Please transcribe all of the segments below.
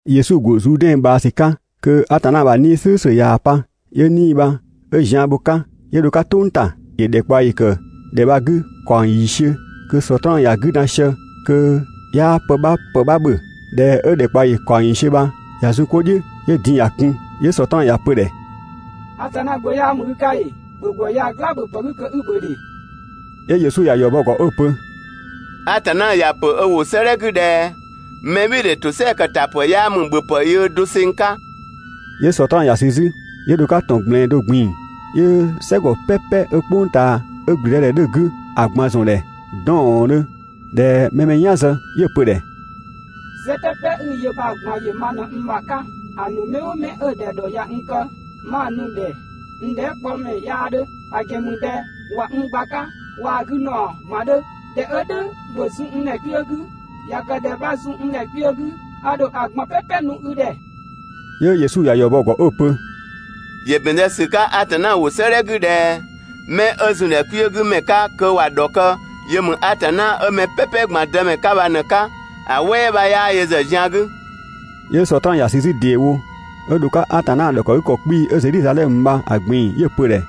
Yesu ‑go Zuudɛn ꞊bhaa ‑sü 'ka kö Atanna ‑bha 'Nii‑ "slʋ̈ʋ̈slʋ̈ ꞊yaa‑ pa. 'Yö 'Nii‑ bha 'ö zian bho‑ 'ka, 'yö dho‑ 'ka "tʋng ‑ta. ‑Yö ‑dhɛkpaɔyi ‑kë ‑dhɛ bha‑ 'gü ‑kaɔng ‑yiisiö kö Sɔtraan ‑ya 'gü dan sië kö 'yaa pë 'bha ‑pë 'bha ‑bhö. ꞊Dhɛ 'ö ‑dhɛkpaɔyi ‑kaɔng ‑yiisiö bha ꞊ya zun 'ko "dhiʋ̈, 'yö din‑ ‑ya kun, 'yö Sɔtraan ‑ya pö‑ ‑dhɛ: «Atanna Gbö 'yaa ‑mü i 'ka ‑ee? ‑Bhö ‑gwë ya‑ "gla ‑bhöpë 'gü kö 'i‑ ‑bhö ‑dhe!» 'Yö Yesu ‑ya ‑yɔ bɔ‑ ‑gɔ 'ö‑ pö: «Atanna ‑ya ‑pö ö ‑wʋ 'sëëdhɛ 'gü ꞊dhɛ: ‹Mɛbhɩɩdhe ‑tosɛa ‑kë ‑ta ‑pë 'yaa ‑mü ‑bhöpë yöö doseng 'ka!›» 'Yö Sɔtraan ‑ya sü 'zü 'yö dho‑ 'ka ‑tɔn ꞊gblɛɛn do ꞊gbin‑, 'yö "sɛgɔ "pɛpɛ 'ö "kpʋng ꞊taa 'ö ‑gblüdëdhɛ 'dhö‑ 'gü ‑a ꞊gban ‑zɔn ‑dhɛ 'dɔɔndhö ꞊dhɛ mɛ‑ mɛ "yan zë, 'yö‑ pö‑ ‑dhɛ: «"Sɛ "pɛpɛ 'i‑ yö bha‑ ꞊gban ‑yö ma ꞊në n ‑bha 'ka, ‑a ‑nu mɛ "ʋʋ mɛ 'ö‑ ‑dhɛ ‑dhɔ ꞊ya n kë 'ma‑ nu‑ ‑dhɛ n dhɛɛkpɔmɛ 'yaa 'dhö; ‑a ‑gɛn ‑mü ꞊dhɛ ꞊wa n gba‑ 'ka waa‑ 'gü ‑naɔ ꞊gban 'dhö. ꞊Dhɛ 'ö "dhʋ̈, ‑bhö zun n ‑dhɛ kpiö 'gü. ꞊Ya kë ꞊dhɛ 'bha zun n ‑dhɛ kpiö 'gü, a ‑dho ‑a ꞊gban "pɛpɛ nu i ‑dhɛ!» 'Yö Yesu ‑ya ‑yɔ bɔ‑ ‑gɔ 'ö‑ pö: «‑Yö ‑bɛn zë ‑sü 'ka Atanna ‑wʋ 'sëëdhɛ 'gü ꞊dhɛ: ‹'Mɛ 'ö ‑zun ‑dhɛ kpiö 'gü ‑mɛ 'ka kö ‑wa ‑dhɔkë, yö ‑mü Atanna 'ö mɛ "pɛpɛ ꞊gban Dëmɛ 'ka bha ꞊në‑ 'ka, ‑a "wɛɛ 'bha 'yaa yö ‑zë zian 'gü.›» 'Yö Sɔtraan ‑ya sü 'zü ‑deewo 'ö dho‑ 'ka Atanna ‑bha 'kɔ 'kpii‑ 'ö Zedhizadhɛmö bha‑ ꞊gbin‑, 'yö‑ pö‑ ‑dhɛ: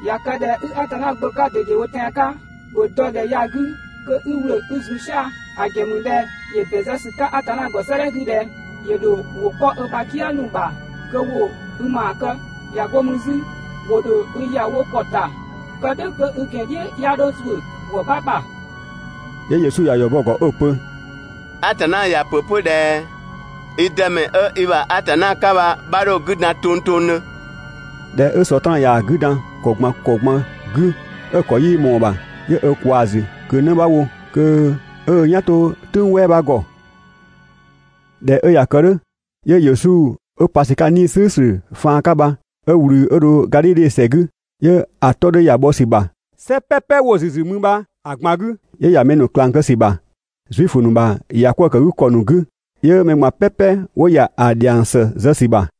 «꞊Ya kë ꞊dhɛ 'i Atanna Gbö 'ka ꞊dedewo tɛan‑ 'ka, ‑bhö dɔ ‑dhɛ ya‑ 'gü kö 'i ‑wlö 'i zun "sia‑, ‑a ‑gɛn ‑mü ꞊dhɛ ‑yö ‑bɛn zë ‑sü 'ka 'pö Atanna ‑gɔ 'sëëdhɛ 'gü ꞊dhɛ: ‹‑Yö ‑dho ‑wʋ 'kpɔ ö ‑bha "kië ‑nu ‑bha kö ‑wo i ‑maa kë› ꞊ya 'go mü 'zü: ‹‑Wo ‑dho i ‑ya wo ‑kɔ ‑ta, kë "dhʋ̈ kö i ‑gɛn "dhiʋ̈ 'ya 'dho ‑zuö ‑gwë 'bha ‑bha.›» 'Yö Yesu ‑ya ‑yɔ bɔ‑ ‑gɔ 'ö‑ pö: «Atanna ‑ya ‑pö 'pö ꞊dhɛ: ‹I Dëmɛ 'ö i ‑bha Atanna 'ka bha 'bha 'dho‑ 'gü dan tongtongdhö!›» ꞊Dhɛ 'ö Sɔtraan ꞊yaa‑ 'gü dan ‑kɔ ꞊gban ‑kɔ ꞊gban 'gü 'ö‑ ‑kɔ 'yii ꞊mɔɔ‑ ‑bha, 'yö ö ꞊kwaa‑ ‑zü ꞊kö 'në bha wo kö 'ö "yan 'to "tʋ̈ng "wɛɛ 'bha ‑gɔ. ꞊Dhɛ 'ö ꞊ya kë "dhʋ̈, 'yö Yesu 'ö pa ‑sü 'ka 'Nii‑ "slʋ̈ʋ̈slʋ̈ faan 'ka bha 'ö ꞊wlü 'ö dho Gadhidhe ‑sɛ 'gü. 'Yö‑ 'tɔ 'dhö ‑ya bhɔ ‑sü ‑bha "sɛ "pɛpɛ 'wo‑ ‑züzü mü bha‑ ꞊gban 'gü. 'Yö ‑ya mɛ ‑nu ꞊klang kë ‑sü ‑bha Zuifö ‑nu ‑bha ‑yakwëëkëgükɔ ‑nu 'gü, 'yö mɛ ꞊gban "pɛpɛ 'wo ‑ya ‑a ‑dhiang ‑së zë ‑sü ‑bha.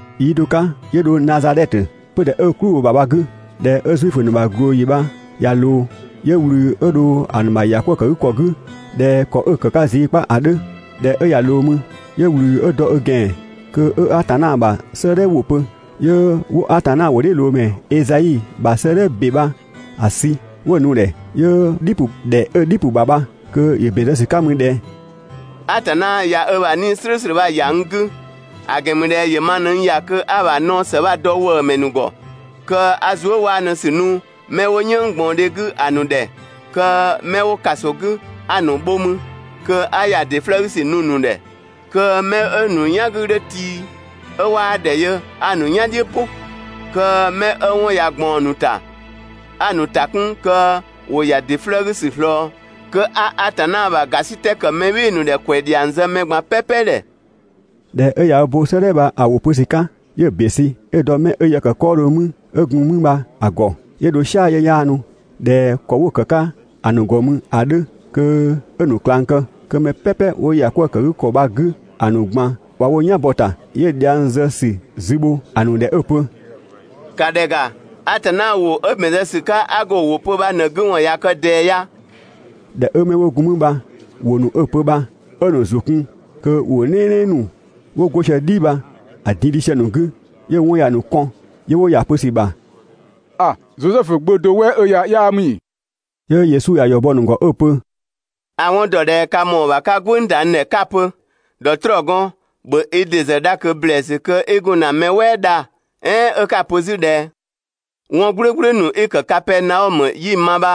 Yi do 'ka 'yö dho Nazadhɛtö, 'pödhɛ 'ö "klʋ bho‑ 'gü bha‑ 'gü. ꞊Dhɛ 'ö Zuifö ‑nu ‑bha ꞊glooyi bha ꞊ya ꞊loo, 'yö ꞊wlü 'ö dho ‑a ‑nu ‑bha ‑ya 'kwëë‑ kë 'gü ‑kɔ 'gü ꞊dhɛ ‑kɔ 'ö‑ kë‑ 'ka zii 'kpa ‑a 'dhö. ꞊Dhɛ 'ö ꞊ya ꞊loo mü, 'yö ꞊wlü 'ö dɔ ö ‑gɛan kö 'ö Atanna ‑bha 'sëëdhɛ ‑wʋ pö. 'Yö 'wo Atanna ‑wʋdhiʋ̈loomɛ Ezai ‑bha 'sëëdhɛ ‑be bha‑ sü 'wo‑ nu‑ ‑dhɛ, 'yö‑ "dhi ‑pʋ. ‑Dhɛ 'ö‑ "dhi ‑pʋ ‑bha bha kö ‑yö ‑bɛn zë ‑sü 'ka mü ꞊dhɛ: «Atanna ꞊ya ö ‑bha 'Nii‑ "slʋ̈ʋ̈slʋ̈ ‑ya n 'gü, ‑a ‑gɛn ‑mü ꞊dhɛ ‑yö ma ꞊në n ‑ya kö 'a‑ ‑bha naɔ ‑së bha‑ dɔ ‑wëëmɛ ‑nu ‑gɔ, kö 'a zuëwaanusü nu 'mɛ 'wo "yënnggbaɔndhe 'gü ‑a ‑nu ‑dhɛ Kö 'mɛ 'wo ‑kaso 'gü 'a‑ ‑nu bho mü, kö 'a ‑ya ‑dɩ 'flëë‑ 'gü ‑sü nu‑ ‑nu ‑dhɛ. Kö 'mɛ 'ö‑ ‑nu "yan 'gü 'dhö tii 'ö 'waa ‑dhɛ yö 'a‑ ‑nu "yan "dhiʋ̈ "pʋ. Kö 'mɛ 'ö 'wɔn ꞊ya ꞊gbaɔn‑ ‑nu ‑ta 'a‑ ‑nu ‑ta 'kun kö ‑wo ‑ya ‑dɩ 'flëë‑ 'gü ‑sü ꞊slɔɔ. Kö 'a Atanna ‑bha ‑gasitɛ ‑kë mɛ "bhɩɩ‑ ‑nu ‑dhɛ ‑kwɛ ‑dhiang zë mɛ ꞊gban "pɛpɛ ‑dhɛ.» ꞊Dhɛ 'ö ꞊ya ö bo 'sëëdhɛ bha‑ ‑wʋ pö ‑sü 'ka, 'yö‑ ‑be sü 'ö‑ dɔ 'mɛ 'ö yë ‑kë 'kɔɔdhö mü 'ö gun mü bha‑ ‑gɔ, 'yö dho "sia‑ 'yö 'yaanu (꞊dhɛ ‑kɔ 'wo‑ ‑kë 'ka‑ ‑nu ‑gɔ mü ‑a 'dhö kö 'ö‑ ‑nu ꞊klang kë). Kö mɛ "pɛpɛ 'wo ‑yakwëëkëgükɔ bha‑ 'gü ‑a ‑nu ꞊gban ꞊wa wo "yan bɔ‑ ‑ta. 'Yö dhiang zë ‑sü zü bho‑ ‑nu ‑dhɛ 'ö‑ pö: «‑Ka ‑dhɛ ‑ga! Atanna ‑wʋ 'ö ‑bɛn zë ‑sü 'ka 'a go‑ ‑wʋ pö bha ꞊në‑ 'gü ‑wɔn ꞊ya kë ꞊dɛɛ ya.» ꞊Dhɛ 'ö 'mɛ 'wo gun mü bha ‑wʋ ‑nu 'ö‑ pö bha 'ö‑ ‑nu ‑zʋ kun kö ‑wʋ "nɛɛnɛɛ ‑nu 'wo 'go sië‑ "dhi bha‑ din‑ dhi sië‑ ‑nu 'gü, 'yö‑ 'wɔn ‑ya ‑nu kɔn, 'yö 'wo ‑ya ‑a pö ‑sü bha: «‑A! Zosɛfu gbö do "wɛ 'ö ya 'yaa ‑mü ‑ee?» 'Yö Yesu ‑ya ‑yɔ bɔ‑ ‑nu ‑gɔ 'ö‑ pö: «A‑ 'wɔn dɔ ꞊dhɛ ka ‑mɔɔ ‑bha 'ka "gwënng ‑da n ‑dhɛ 'ka‑ pö: «‑Dhɔtrɔɔgɔn, ‑bhö i ‑dɩ ‑zë dha ꞊kö ‑blɛɛsü kö 'i gun ‑na mɛ "wɛɛ dha». "Ɛɛn 'ö 'ka‑ pö 'zü ꞊dhɛ: «'Wɔn "gblʋ̈gblʋ̈ ‑nu 'i‑ ‑kë Kapɛɛnaɔmö 'yi‑ ma bha,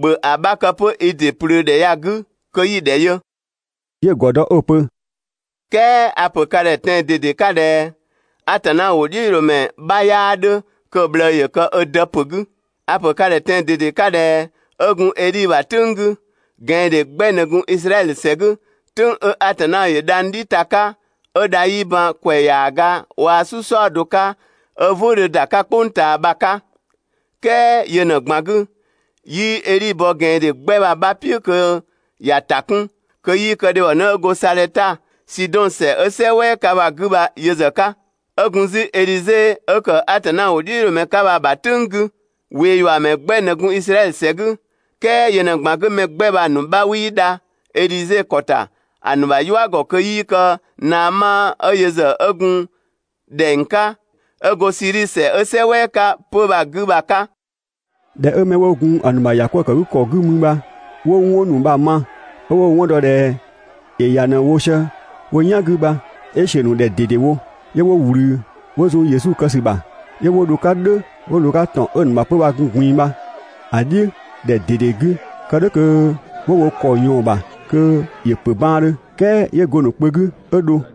‑bhö ‑a 'bha kë 'pö i ‑dɩ ꞊plöö ‑dhɛ ya‑ 'gü kö 'yi‑ ‑dhɛ yö»». 'Yö‑ ‑gɔ dɔ 'ö‑ pö: «"Kɛɛ a‑ ‑pö ka ‑dhɛ tɛan‑ ꞊dede 'ka ꞊dhɛ Atanna ‑wʋdhiʋ̈loomɛ 'bha 'yaa 'dhö kö‑ ꞊bhlëë ‑yö kë ö dë ‑pö 'gü. A‑ ‑pö ka ‑dhɛ tɛan‑ ꞊dede 'ka ꞊dhɛ 'ö gun Edhi ‑bha "tʋ̈ng 'gü, ꞊gɛandhe 'gbɛ ꞊në gun Izraɛdhö ‑sɛ 'gü, "tʋ̈ng 'ö Atanna ‑yö dhang‑ "dhi ta‑ 'ka 'ö dha 'yii ban ‑kwɛ ‑yaaga waa‑ "su "saɔdo 'ka, 'ö "vʋ̈ʋ̈ 'dhö ‑da 'ka "kpʋng ꞊taa bha‑ 'ka. "Kɛɛ yö ꞊në‑ ꞊gban 'gü, 'yii Edhi bɔ ꞊gɛandhe 'gbɛ bha‑ 'bha "piʋ̈ kö ‑ya ‑ta 'kun kö 'yii kë dhebhɔnë 'ö go Sadhɛta, Sidɔn ‑sɛ 'ö "sɛ "wɛɛ 'ka bha‑ 'gü bha yö ‑zë 'ka. 'Ö gun 'zü Edhize 'ö ‑kë Atanna ‑wʋdhiʋ̈loomɛ 'ka bha‑ ‑bha "tʋ̈ng 'gü, ꞊weeyuamɛ 'gbɛ ꞊në gun Izraɛdhö ‑sɛ 'gü, "kɛɛ yö ꞊në‑ ꞊gban 'gü mɛ 'gbɛ bha‑ ‑nu 'bha 'wii dha Edhize ‑kɔ ‑ta ‑a ‑nu ‑bha "yua ‑gɔ kö 'yii kë Naama ('ö yö ‑zë 'ö gun ‑dhɛng 'ka) 'ö go Siidhi ‑sɛ 'ö "sɛ "wɛɛ 'ka 'pö bha‑ 'gü bha‑ 'ka. ꞊Dhɛ 'ö 'mɛ 'wo gun‑ ‑nu ‑bha ‑yakwëëkëgükɔ 'gü mü bha 'wo 'wɔn ‑nu bha‑ ma, 'ö 'wo‑ 'wɔn dɔ ꞊dhɛ ‑yö ‑ya ꞊në‑ wo sië wo "yan 'gü bha, 'yö ‑siö ‑nu ‑dhɛ ꞊dedewo. 'Yö 'wo ꞊wlü 'wo zun Yesu kë ‑sü ‑bha, 'yö 'wo dho‑ 'ka "dhʋ̈ 'wo ꞊loo‑ 'ka ‑tɔn 'ö‑ ‑nu ‑bha 'pö‑ gun‑ ꞊gbin‑ bha‑ "dhiʋ̈ ‑dhɛ ꞊dede 'gü, kë "dhʋ̈ kö 'wo wo ‑kɔ ꞊yɔɔn‑ ‑bha kö ‑yö ‑pö baandhö; "kɛɛ 'yö go‑ ‑nu kpö 'gü 'ö dho.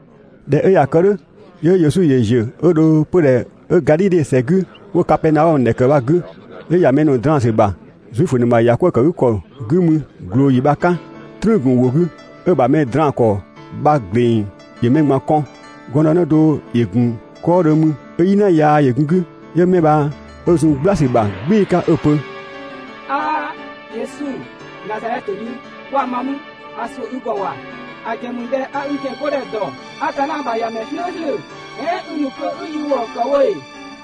꞊Dhɛ 'ö ꞊ya kë "dhʋ̈, 'yö Yesu ‑yö ‑ziö 'ö dho 'pödhɛ 'ö Gadhidhe ‑sɛ 'gü 'wo‑ Kapɛɛnaɔmö ‑dhɛ ‑kë bha‑ 'gü, 'yö ‑ya mɛ ‑nu draan‑ ‑sü ‑bha Zuifö ‑nu ‑bha ‑yakwëëkëgükɔ 'gü mü ꞊glooyi bha‑ 'ka. "Trüün‑ ‑gun ‑wʋ 'gü, 'ö‑ ‑bha mɛ draan‑ ‑kɔ bha‑ ‑gleng ‑yö mɛ ꞊gban kɔn. Gɔndënë do ‑yö ‑gun 'kɔɔdhö mü 'ö "yina yaa ‑yö gun‑ 'gü. 'Yö 'mɛ bha 'ö zun "gbla ‑sü ‑bha "gbɩɩ‑ 'ka 'ö‑ pö: «'Aa! Yesu, Nazadhɛtö mi, 'kwa ma mü! A ‑suʋ̈ i ‑gɔ ‑wa! ‑A ‑gɛn ‑mü ꞊dhɛ a i ‑gɛn 'godhɛ ‑dɔ, Atanna ‑bha ‑Yamɛ "slʋ̈ʋ̈slʋ̈! "Ɛɛn i ‑nu kö 'i yi ‑wëë ‑kë wo ‑ee?»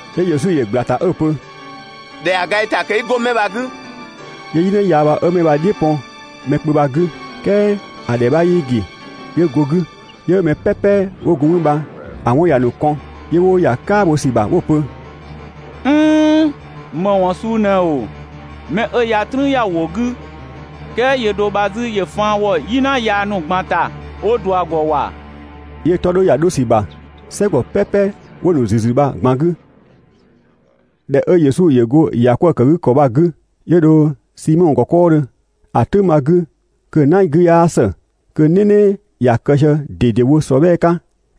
'Yö Yesu ‑yö ꞊gbla‑ ‑ta 'ö‑ pö: «‑Dhɛa ga i ‑ta kö 'i 'go 'mɛ bha‑ 'gü!» 'Yö "yina yaa bha 'ö 'mɛ bha‑ "dhiʋ̈ pɔn mɛ kpö bha‑ 'gü, "kɛɛ ‑a ‑dhɛ 'bha 'yii ‑gi, 'yö go‑ 'gü. 'Yö mɛ "pɛpɛ 'wo gun mü bha‑ 'wɔn ‑ya ‑nu kɔn, 'yö 'wo ‑ya "kaa ‑sü bha 'wo‑ pö: «"Nn‑, ‑më ‑wɔn suu ꞊nɛ ‑oo? 'Mɛ 'ö ya "trüün ‑ya ‑wʋ 'gü, "kɛɛ yöö do bha 'zü ‑yö faan ‑wɔ "yina yaa ‑nu ꞊gban ‑ta 'wo ꞊dua‑ ‑gɔ ‑wa! 'Yö‑ 'tɔ 'dhö ‑ya 'dho ‑sü ‑bha "sɛgɔ "pɛpɛ 'wo‑ ‑nu ‑züzü bha‑ ꞊gban 'gü. ꞊Dhɛ 'ö Yesu ‑yö go ‑yakwëëkëgükɔ bha‑ 'gü, 'yö dho Simɔ ‑gɔ 'kɔɔdhö. ‑A "tʋ̈ng bha‑ 'gü kö‑ "na 'gü 'yaa ‑së, kö "nɛnɛ ‑ya kë sië ꞊dedewo ‑sɔbhɛɛ 'ka.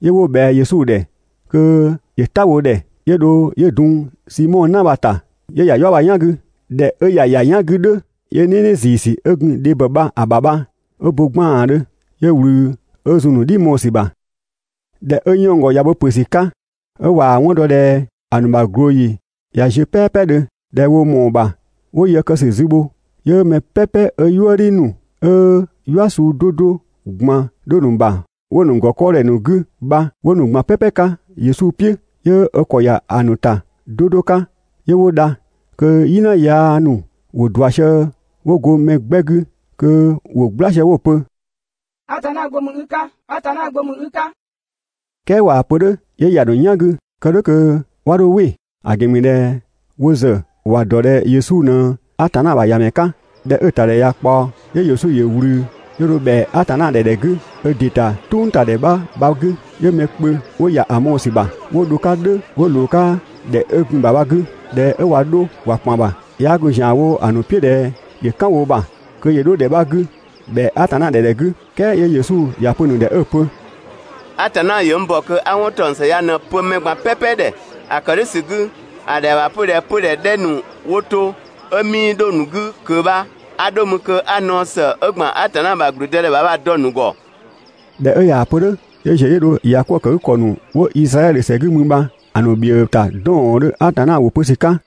'Yö 'wo ꞊bhɛa Yesu ‑dhɛ kö ‑yö "ta wo ‑dhɛ. 'Yö dho 'yö dun Simɔ "na bha‑ ‑ta, 'yö ‑ya "yua bha‑ "yan 'gü. ꞊Dhɛ 'ö ꞊ya ‑ya "yan 'gü "dhʋ̈, 'yö "nɛnɛ ‑ziisü 'ö gun dhebhɔ bha‑ ‑bha bha 'ö bo 'gbaandhö, 'yö ꞊wlü 'ö zun‑ ‑nu "dhi mɔɔ‑ ‑sü ‑bha. ꞊Dhɛ 'ö 'yënng‑ ‑gɔ ꞊ya bo ‑pö ‑sü 'ka ('ö ꞊waa‑ 'wɔn dɔ ꞊dhɛ ‑a ‑nu ‑bha ꞊glooyi ꞊ya ziö "pɛɛpɛdhö, ꞊dhɛ wo ‑mɔɔ ‑bha 'wo yë kë ‑sü zü bho), 'yö mɛ "pɛpɛ 'ö "yuëdhi ‑nu 'ö "yua suu 'do 'do ꞊gban 'dhö‑ ‑nu ‑bha 'wo‑ ‑nu ‑gɔ 'kɔɔdhɛ ‑nu 'gü bha 'wo nu‑ ꞊gban "pɛpɛ 'ka Yesu "piʋ̈, 'yö ö ‑kɔ ‑ya ‑a ‑nu ‑ta 'do 'do 'ka 'yö 'wo dha. Kö "yina yaa ‑nu ‑wo ꞊dua sië 'wo go mɛ 'gbɛ 'gü kö ‑wo "gbla sië 'wo‑ pö: «Atanna Gbö ‑mü i 'ka! Atanna Gbö ‑mü i 'ka!» "Kɛɛ ꞊waa‑ pö "dhʋ̈ 'yö ‑ya ‑nu "yan 'gü kë "dhʋ̈ kö 'wa 'dho "wɩ; ‑a ‑gɛn ‑mü ꞊dhɛ wo ‑zë ‑wa ‑dɔ ꞊dhɛ Yesu ꞊në Atanna ‑bha ‑Yamɛ 'ka. ꞊Dhɛ 'ö‑ ‑tadhɛ ꞊ya ꞊kpaɔ, 'yö Yesu ‑yö ꞊wlü 'yö dho ‑bhɛa Atanna ‑dhɛ ‑dhɛ 'gü ö ‑dɩ ‑ta "tʋngtadhɛ 'bha bha‑ 'gü. 'Yö mɛ kpö 'wo ‑ya ‑a mɔɔ‑ ‑sü ‑bha 'wo dho‑ 'ka "dhʋ̈ 'wo ꞊loo‑ 'ka ‑dhɛ 'ö gun‑ ‑bha bha‑ 'gü. ꞊Dhɛ 'ö ꞊wa 'dho ꞊wa ‑kpan ‑bha, 'yaa gun ‑zian wo‑ ‑nu "piʋ̈ ꞊dhɛ ‑yö "kan wo ‑bha kö ‑yö 'dho ‑dhɛ 'bha 'gü ‑bhɛa Atanna ‑dhɛ ‑dhɛ 'gü, "kɛɛ 'yö Yesu ‑ya pö‑ ‑nu ‑dhɛ 'ö‑ pö: «Atanna ‑yö n ‑bɔ kö 'a 'wɔn ‑taɔng ‑së ya ꞊në‑ pö mɛ ꞊gban "pɛpɛ ‑dhɛ. ‑A ‑kë "dhʋ̈ ‑sü 'gü, ‑a ‑dhɛa ‑bha 'pö ꞊dhɛ 'pödhɛ ‑dhɛ ‑nu 'wo to 'ö 'mii 'dho‑ ‑nu 'gü ꞊kö bha 'a 'dho mü kö 'a naɔ ‑së 'ö ‑gban ‑a ‑bha ‑gblüdëdhɛ ‑bha bha‑ dɔ‑ ‑nu ‑gɔ. ꞊Dhɛ 'ö ꞊yaa‑ pö "dhʋ̈, 'yö ‑ziö 'yö dho ‑yakwëëkëgükɔ ‑nu 'wo Izraɛdhö ‑sɛ 'gü mü bha‑ ‑nu ‑bhiëë ‑ta 'dɔɔndhö Atanna ‑wʋ pö ‑sü 'ka.